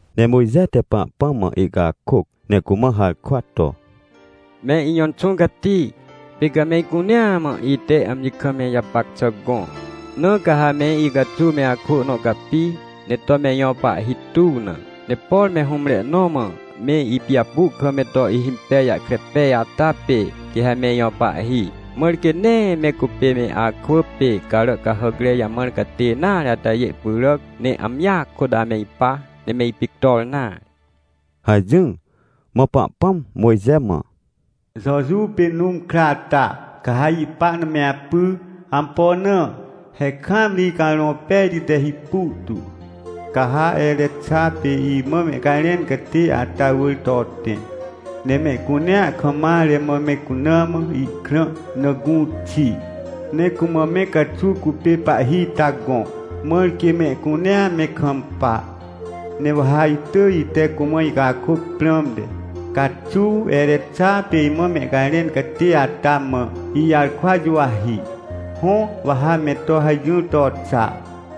Ne Mojxe te Pahpãm mã ihcakôc ne cumã harkwa to: — Me ijõ Inxũ Cati, pê ca me icunea mã ite amji kam me ijapac xà gõ, na caha meicaxuw me akwỳ nõ capi, ne to me ijõ pahhi tuw na. Ne por me hũmre nõ mã meipijapu kam me to ihhimpej jahkre pej ata pê, quê ha me ijõ pahhi, mãr quê nee me cupê me akwỳ pê carà cahàcrejamãr catê nare atajê pyràc, ne amjia kôt ame ipa, ne me ipictor nare — hajỹr. Mã Pahpãm Mojxe mã: — Jojuw pê Nũm kra ata, ca ha ihpa na me apy. Ampo na? He kaamri Icarõ Pejti te hipu tu. Ca ha Erexa pê imã mehcajrẽncatê ata wỳr to tẽ, ne mehcunea kammare mã me cuna mã ihkrã na gũ xi. Ne cumã me caxuw cupê pahhi ita gõ, mãr quê mehcunea me kampa. Ne wa ha itỳj ite cumã icakôc prãmte, caxuwErexa pê imã mehcajrẽn catê ata mã ijarkwa juwahi. — Hõ, wa ha me to hajỹr to xa.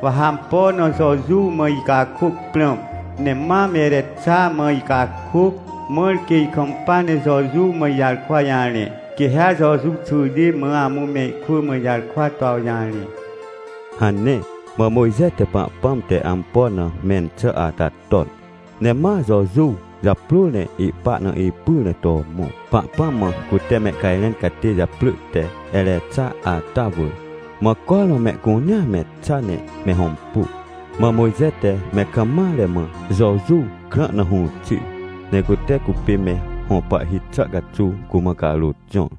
Wa ha ampo na Jojuw mãicakôc prãm, ne mam Erexa mã icakôc, mãr quê ikampa ne Jojuw mãijarkwa jarẽ, quê ha Jojuw xwỳjê ma amũ mehkwỳ mã ijarkwa toawjarẽ — hane. Mã Mojxe te Pahpãm te ampo na mẽn xà ata ton, ne maJojuw japrôr ne ihpa na ipyr ne to mõ, Pahpãm mã cute mehcajrẽn catêjaprỳ teErexa ata wỳr. Mã cormã mehcunea me xa ne me hõmpu, mã Mojxe te me kammare mã Jojuw krã na hũ xir, necute cupê me hõ pahhi xà caxuw cumã carôt jõr.